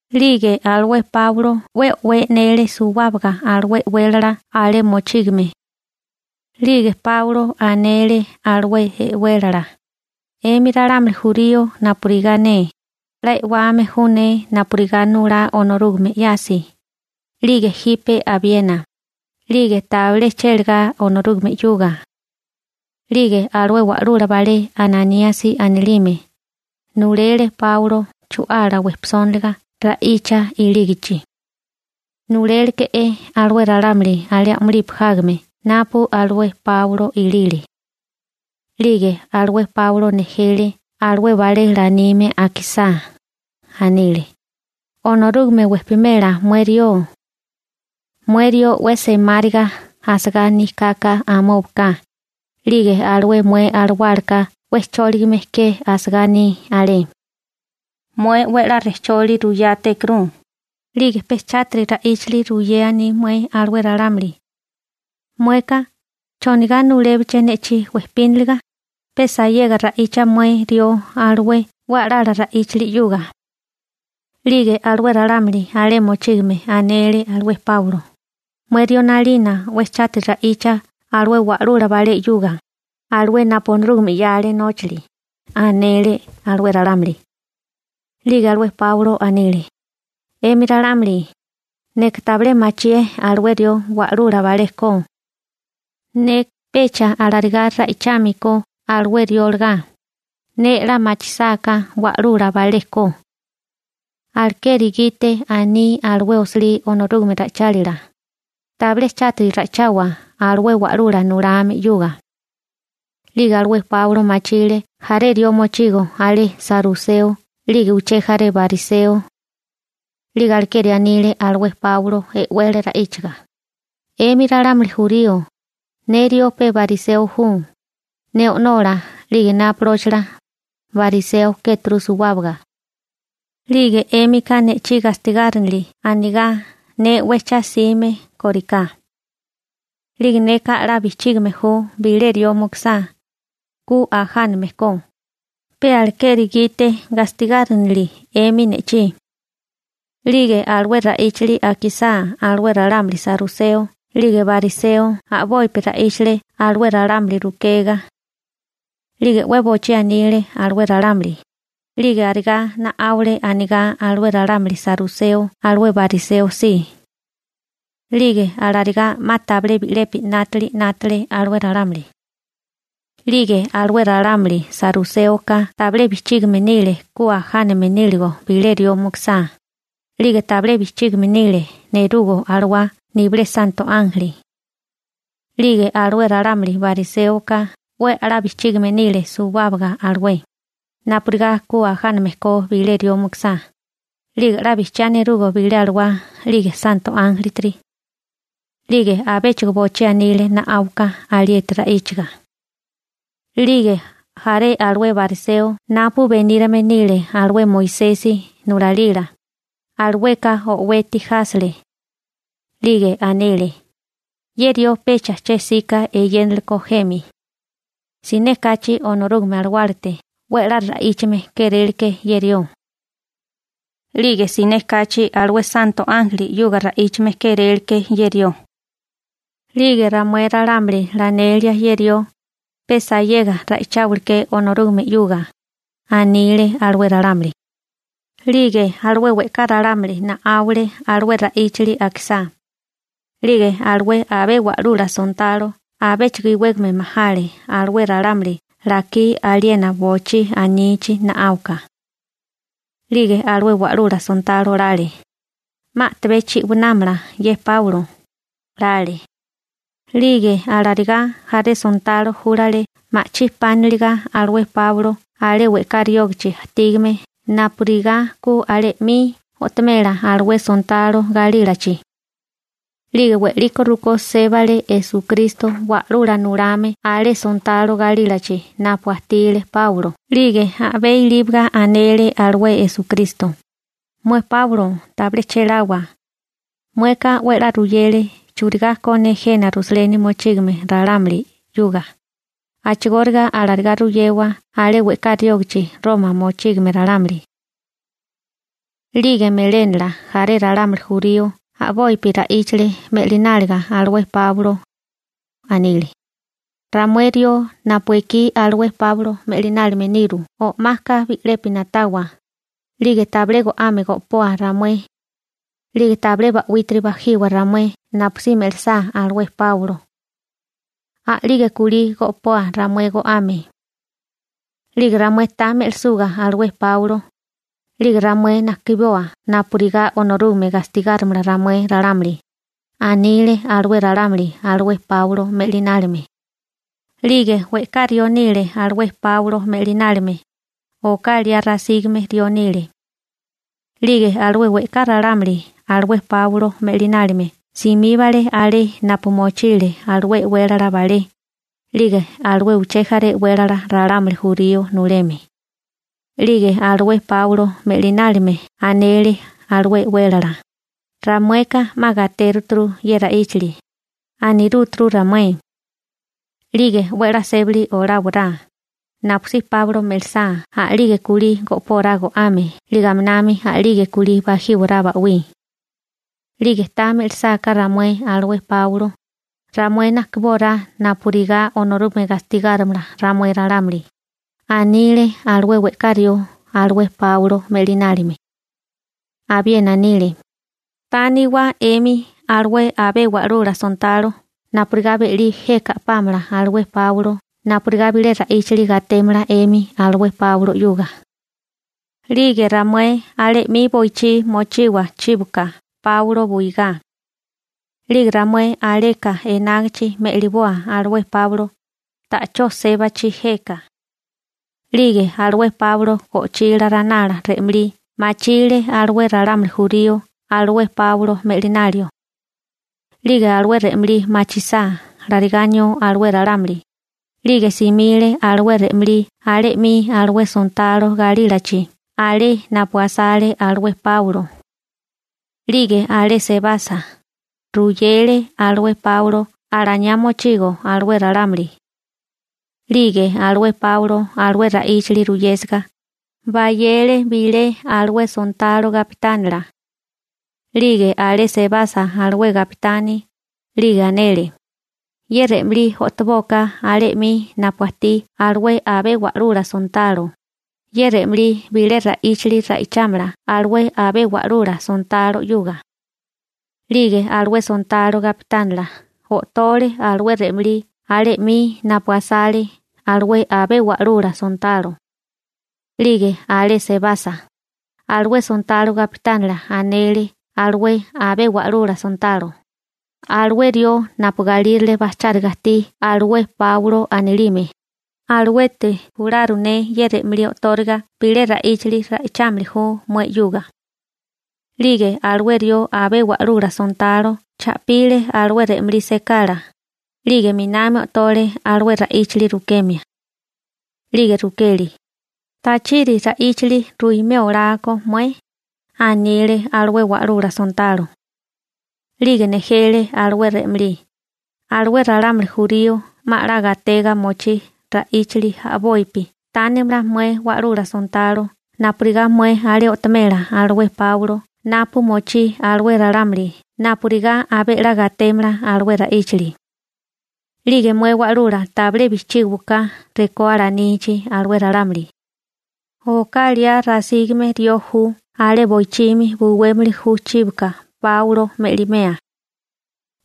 'Lige alué Páulo 'we o'wé e'nele suwábaga alué e'wélala alé mochígame. 'Lige Páulo anele alué e'wélala: ―'Emi ralámuli jurío napurigá ne, 'la e'wame ju ne napurigá nulá Onorúgame 'yasi, 'lige jipe abiena, 'lige tabilé chélagá Onorúgame 'yuga. 'Lige alué wa'lula balé Ananíasi anilime, nulele Páulo chu'ala wejpisóniliga ra'icha ilígichi. Nuléleke'é alué ralámuli alé a'mulipi jágame napu alué Páulo ilile. 'Lige alué Páulo nejele alué balé lanime akisá, anile: ―Onorúgame wejpimela mué rió. Mué rió 'we semáriga asagá aní kaka amóbaka, 'lige alué mué alawálaka 'we chóligame ke asagá aní alé. Mué 'we a'lá rejcholi ruyétékuru, 'lige pe chátiri ra'íchili ruyé aní mué alué ralámuli. Mueka ¿chonigá nulébeché ne'chí wejpíniliga? Pe sayega ra'icha mué rió alué 'we a'lala ra'íchili 'yuga. 'Lige alué ralámuli alé mochígame anele alué Páulo: ―Mué rió 'nalina 'we chátiri ra'icha alué wa'lula balé 'yuga, alué napu Onorúgame 'yale nóchili ―anele alué ralámuli. 'Lige alué Páulo anele: ―'Emi ralámuli, neka tabilé machié alué rió wa'lula balé ko. Neka pecha larigá ra'ichámilikó alué rió olagá, 'la machisáká ne wa'lula balé ko alué rió. Alekeri gite aní alué osilí Onorúgame ra'ichálila: «Tabilé chátiri ra'ichawa alué wa'lula nulame 'yuga.» 'Lige alué Páulo machile jaré rió mochigo alé saruseo 'lige uché jaré bariseo. 'Lige alekeri anile alué Páulo e'wele ra'íchaga: ―'Emi ralámuli jurío, ne rió pe bariseo ju, ne o'nola 'lige ne apolóchila, bariseo kéturu suwábaga. 'Lige 'émika ne'chí gastigárinili anigá ne 'we cha 'sime kóriká. 'Lige neka 'la bijchígime ju bilé rió mukusá, ku ajáname ko, pe alekeri gite gastigárinili 'emi ne'chí. 'Lige alué ra'íchili akisá alué ralámuli saruseo 'lige bariseo a'bopi ra'íchale alué ralámuli rukega. 'Lige 'we bochí anile alué ralámuli, 'lige arigá na'áwale anigá alué ralámuli saruseo alué bariseo si. 'Lige alarigá 'ma tabilé bi'lepi 'nátili 'nátale alué ralámuli. 'Lige alué ralámuli saruséoka tabilé bijchígame nile ku ajáname níligo bilé rió mukusá, 'lige tabilé bijchígime nile neruga alawá nibilé santo ánjeli. 'Lige alué ralámuli bariséoka 'we a'lá bijchígime nile suwábaga alué, napurigá ku ajáname ko bilé rió mukusá, 'lige 'la bijchiá neruga bilé alawá 'lige santo ánjelitiri. 'Lige abéchigo bochí anile na'áuka alieti ra'íchiga. 'Lige jaré alué bariseo napu benírame nile alué Moisesi nulalila, alueka o'weti jásele. 'Lige anile: ―Ye rió pecha che 'sika eyéneleko jemi. Siné kachi Onorúgame Alawálate 'we a'lá ra'íchame kéréleké ye rió. 'Lige siné kachi alué santo ánjeli 'yuga ra'íchame kéréleké ye rió. 'Lige ramué ralámuli lanelia ye rió, pe sayega ra'icháwaleké Onorúgame 'yuga ―anile alué ralámuli. 'Lige alué we'ká ralámuli na'áwale alué ra'íchili akisá. 'Lige alué abé wa'lula sontalo abéchigo iwégame majale alué ralámuli lakí aliena bochí anichi na'áuka. 'Lige alué wa'lula sontalo lale, «'ma a'tabé chi'wanámala ye Páulo», 'lale. 'Lige alarigá jaré sontalo júlale ma'chí pániliga alué Páulo alé we'ká riógichi ajtígame napurigá ku alé 'mi o'tomela alué sontalo galílachi. 'Lige we'liko rukó sébale Esukristo Wa'lula Nulame alé sontalo galílachi napu ajtile Páulo 'lige a'bé ilíbaga anele alué Esukristo: ―Mué Páulo tabilé chéláwa, mueka 'we 'la ruyele churigá ko ne jena Rusaleni mochígame ralámuli 'yuga, a'chigóriga alarigá ruyewa alé we'ká riógachi Roma mochígame ralámuli. 'Lige melénala jaré ralámuli jurío a'bopi ra'íchale me'lináliga alué Páulo. Anile: ―Ramué rió napu ekí alué Páulo me'linálime niru o'maka bi'lepi na'tawa, 'lige tabilé go'ame go'poa ramué, 'lige tabilé ba'wítiri bajiwa ramué napusí me'lisá alué Páulo. A'lige kulí go'poa ramué go'ame. 'Lige ramué ta me'lisuga alué Páulo, 'lige ramué najkiboa napurigá Onorúgame gastigárimala ramué ralámuli ―anile alué ralámuli alué Páulo me'linálime. 'Lige we'ká rió nile alué Páulo me'linálime, oká liá rasígame rió nile. 'Lige alué we'ká ralámuli alué Páulo me'linálime simíbale alé napu mochile alué e'wélala balé, 'lige alué uché jaré e'wélala ralámuli jurío nuleme. 'Lige alué Páulo me'linálime anele alué e'wélala: ―Ramueka 'ma gatéruturu ye ra'íchili ―anirúturu ramué―. 'Lige 'we 'la sébali oláwará, napusí Páulo me'lisá a'lige kulí go'pórá go'ame 'lige aminami a'lige kulí bajíwará ba'wí. 'Lige ta me'lisáká ramué alué Páulo, ramué najkibórá napurigá Onorúgame gastigárimala ramué ralámuli ―anile alué we'ká rió alué Páulo me'linálime. Abiena anile: ―Tániwa 'emi alué abé wa'lula sontalo napurigá be'lí jeka a'pámala alué Páulo napurigá bilé ra'íchili gatémala 'emi alué Páulo 'yuga. 'Lige ramué alé 'mi boichí mochiwa chíboka Páulo buigá. 'Lige ramué aleka enágichi me'liboa alué Páulo, ta'chó sébachi jeka. 'Lige alué Páulo go'chila ranala re'malí machile alué ralámuli jurío alué Páulo me'linalio. 'Lige alué re'malí machisá larigá anió alué ralámuli, 'lige simile alué re'malí alé 'mi alué sontalo galílachi alé napu asale alué Páulo. 'Lige alé sebasa, ruyele alué Páulo alaniá mochigo alué ralámuli. 'Lige alué Páulo alué ra'íchili ruyésiga, bayele bilé alué sontalo gapitánila. 'Lige alé sebasa alué gapitani, 'lige anele: ―Ye re'malí o'tobóká alé 'mi napu ajtí alué abé wa'lula sontalo, ye re'malí bilé ra'íchili ra'ichámala alué abé wa'lula sontalo 'yuga. 'Lige alué sontalo gapitánila o'tole alué re'malí alé 'mi napu asale alué abé wa'lula sontalo. 'Lige alé sebasa, alué sontalo gapitánila anele alué abé wa'lula sontalo: ―Alué rió napu galírale bajcháriga ajtí alué Páulo anilime, aluete jularu ne ye re'malí o'tóriga bilé ra'íchali ra'ichámili ju mué 'yuga. 'Lige alué rió abé wa'lula sontalo cha'pile alué re'malí sekala, 'lige 'minami o'tole alué ra'íchili rukemia. 'Lige rukele: ―¿Tachiri ra'íchili ruimé olá ko mué? ―anile alué wa'lula sontalo. 'Lige nejele alué re'malí: ―Alué ralámuli jurío 'ma 'la gatega mochí ra'íchali a'bopi tánimala mué wa'lula sontalo napurigá mué alé o'tomela alué Páulo napu mochí alué ralámuli napurigá abé 'la gatémala alué ra'íchali. 'Lige mué wa'lula tabilé bijchígiwaká rekó alanichi alué ralámuli. Oká liá rasígame rió ju alé boichimi buwémili ju chíboka Páulo me'limea.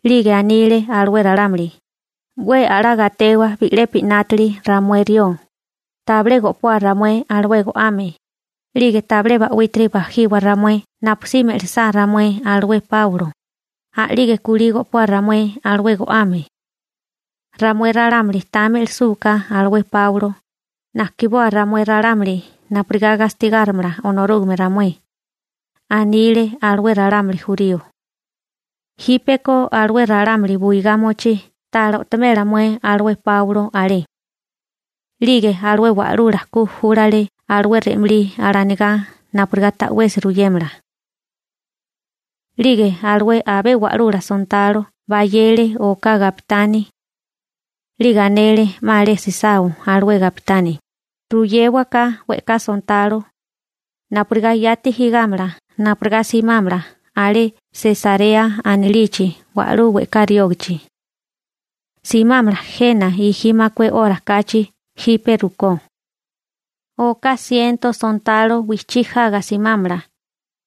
'Lige anile alué ralámuli: «'We a'lá gatewa bi'lepi 'nátili ramué rió, tabilé go'poa ramué alué go'ame, 'lige tabilé ba'wítiri bajiwa ramué napusí me'lisá ramué alué Páulo, a'lige kulí go'poa ramué alué go'ame. Ramué ralámuli ta me'lisúká alué Páulo, najkiboa ramué ralámuli napurigá gastigárimala Onorúgame ramué», anile alué ralámuli jurío. Jípeko alué ralámuli buigá mochí ta'lá o'tomela mué alué Páulo alé. 'Lige alué wa'lula ku júlale alué re'malí alanigá napurigá ta'wesi ruyémala. 'Lige alué abé wa'lula sontalo bayele oká gapitani. 'Lige anele 'ma alé sisao alué gapitani: ―Ruyéwaká we'ká sontalo napurigá yati jigámala napurigá simámala alé Sesarea anilichi wa'lú we'ká riógichi. Simámala jena gi makué 'ora kachi jipe rukó. Oká siento sontalo wijchí jaga simámala,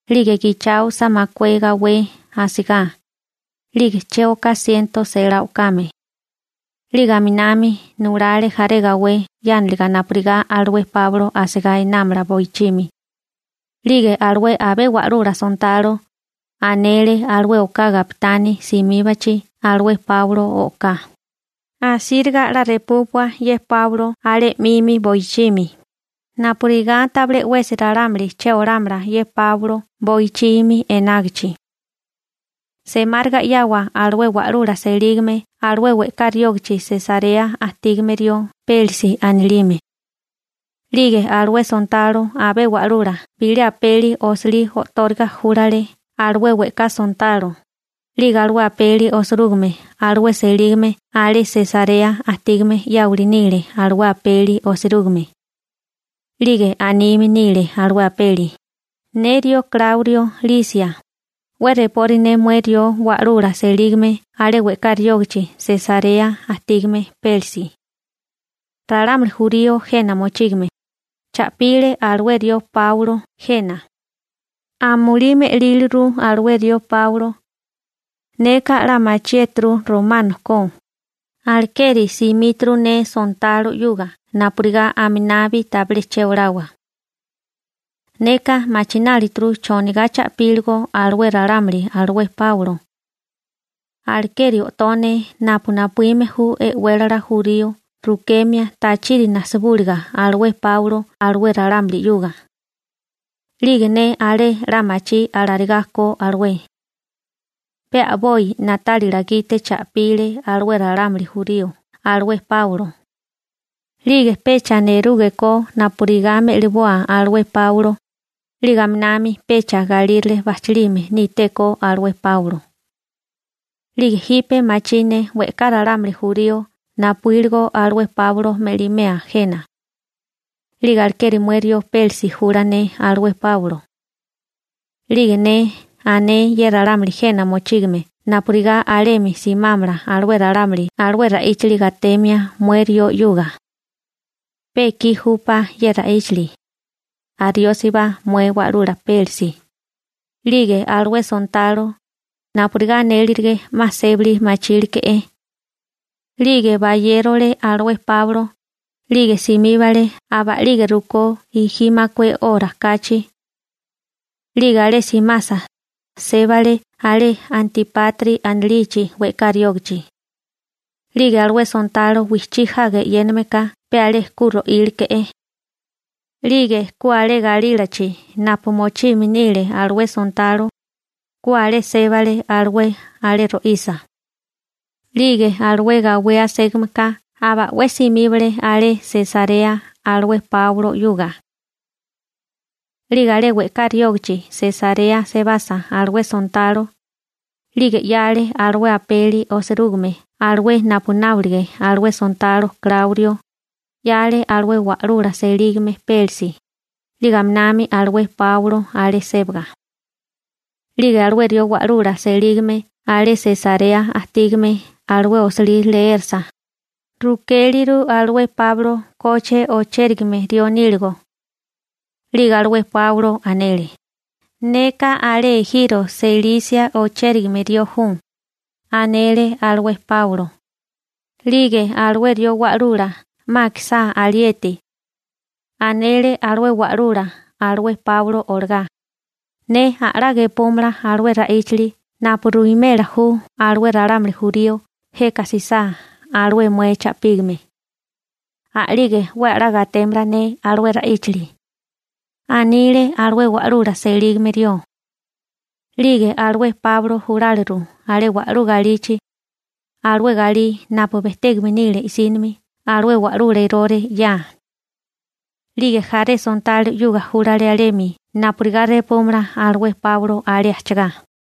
'lige gicháosa makué gawé asigá, 'lige che oká siento selá o'kame. 'Lige aminami nulale jaré gawé 'yániliga napurigá alué Páulo asigá enámala boichimi. 'Lige alué abé wa'lula sontalo, anele alué oká gapitani simíbachi alué Páulo o'ká: ―Asíriga 'la repúpua ye Páulo alé 'mimi boichimi, napurigá tabilé 'wesi ralámuli che olámala ye Páulo boichimi enágichi. Semáriga 'yawa alué wa'lula selígame alué we'ká riógichi Sesarea ajtígame rió Pélisi anilime. 'Lige alué sontalo abé wa'lula bilé apeli osilí o'tóriga júlale alué we'ká sontalo, 'lige alué apeli osirúgime alué selígame alé Sesarea ajtígame 'yáwili nile alué apeli osirúgime. 'Lige anime nile alué apeli: «Ne rió Kláurio Lisia, 'we repori ne mué rió wa'lula selígame alé we'ká riógichi Sesarea ajtígame Pélisi. Ralámuli jurío jena mochígame, cha'pile alué rió Páulo jena. Amulí me'líliru alué rió Páulo. Neka 'la machiéturu romano ko, alekeri simíturu ne sontalo 'yuga napurigá aminabi tabilé che olawa. Neka machinálituru chonigá cha'píligo alué ralámuli alué Páulo. Alekeri o'tó ne napu napuíme ju e'wélala jurío rukemia tachiri najsibúliga alué Páulo alué ralámuli 'yuga. 'Lige ne alé 'la machí alarigá ko alué. Pe a'boi na'tálila gite cha'pile alué ralámuli jurío alué Páulo. 'Lige pecha nerúgekó napurigá me'liboa alué Páulo, 'lige aminami pecha galírale bajchálime nítéko alué Páulo. 'Lige jipe machí ne we'ká ralámuli jurío napuíligo alué Páulo me'limea jena. 'Lige alekeri mué rió Pélisi jula ne alué Páulo. 'Lige ne ané ye ralámuli jena mochígame napurigá alemi simámala alué ralámuli alué ra'íchili gatemia mué rió 'yuga. Pe ekí júpá ye ra'íchili. Ariósibá mué wa'lula Pélisi.» 'Lige alué sontalo, napurigá anélirige 'ma sébali mochíleke'é. 'Lige bayérole alué Páulo, 'lige simíbale aba a'lige rukó gi makué 'ora kachi. 'Lige alé simasa, sébale alé Antipatri anilichi we'ká riógichi. 'Lige alué sontalo wijchí jaga e'yéname ka pe alé ku ro'íleke'é. 'Lige ku alé galílachi napu mochime nile alué sontalo, ku alé sébale alué alé ro'isa. 'Lige alué gawé aségameka aba 'we simíbale alé Sesarea alué Páulo 'yuga. 'Lige alé we'ká riógichi Sesarea sebasa alué sontalo, 'lige 'yale alué apeli osirúgime alué napu nábolige alué sontalo Kláurio, 'yale alué wa'lula selígame Pélisi, 'lige aminami alué Páulo alé sébaga. 'Lige alué rió wa'lula selígame alé Sesarea ajtígame alué osilí leérasa, rukéliru alué Páulo koche ochérigame rió níligo. 'Lige alué Páulo anele: ―Neka alé ejiro Selisia ochérigame rió ju ―anele alué Páulo. 'Lige alué rió wa'lula 'ma akisá alieti, anele alué wa'lula alué Páulo olagá: ―Ne a'lá gepúmala alué ra'íchili napu ruwimela ju alué ralámuli jurío jeka jsisá alué mué cha'pígame. A'lige 'we a'lá gatémala ne alué ra'íchali ―anile alué wa'lula selígame rió. 'Lige alué Páulo juláliru alé wa'lú galichi, alué galí napu bejtégame nile i'sínimi alué wa'lula Erore 'ya. 'Lige jaré sontalo 'yuga júlale alemi napurigá repúmala alué Páulo alé ajchagá.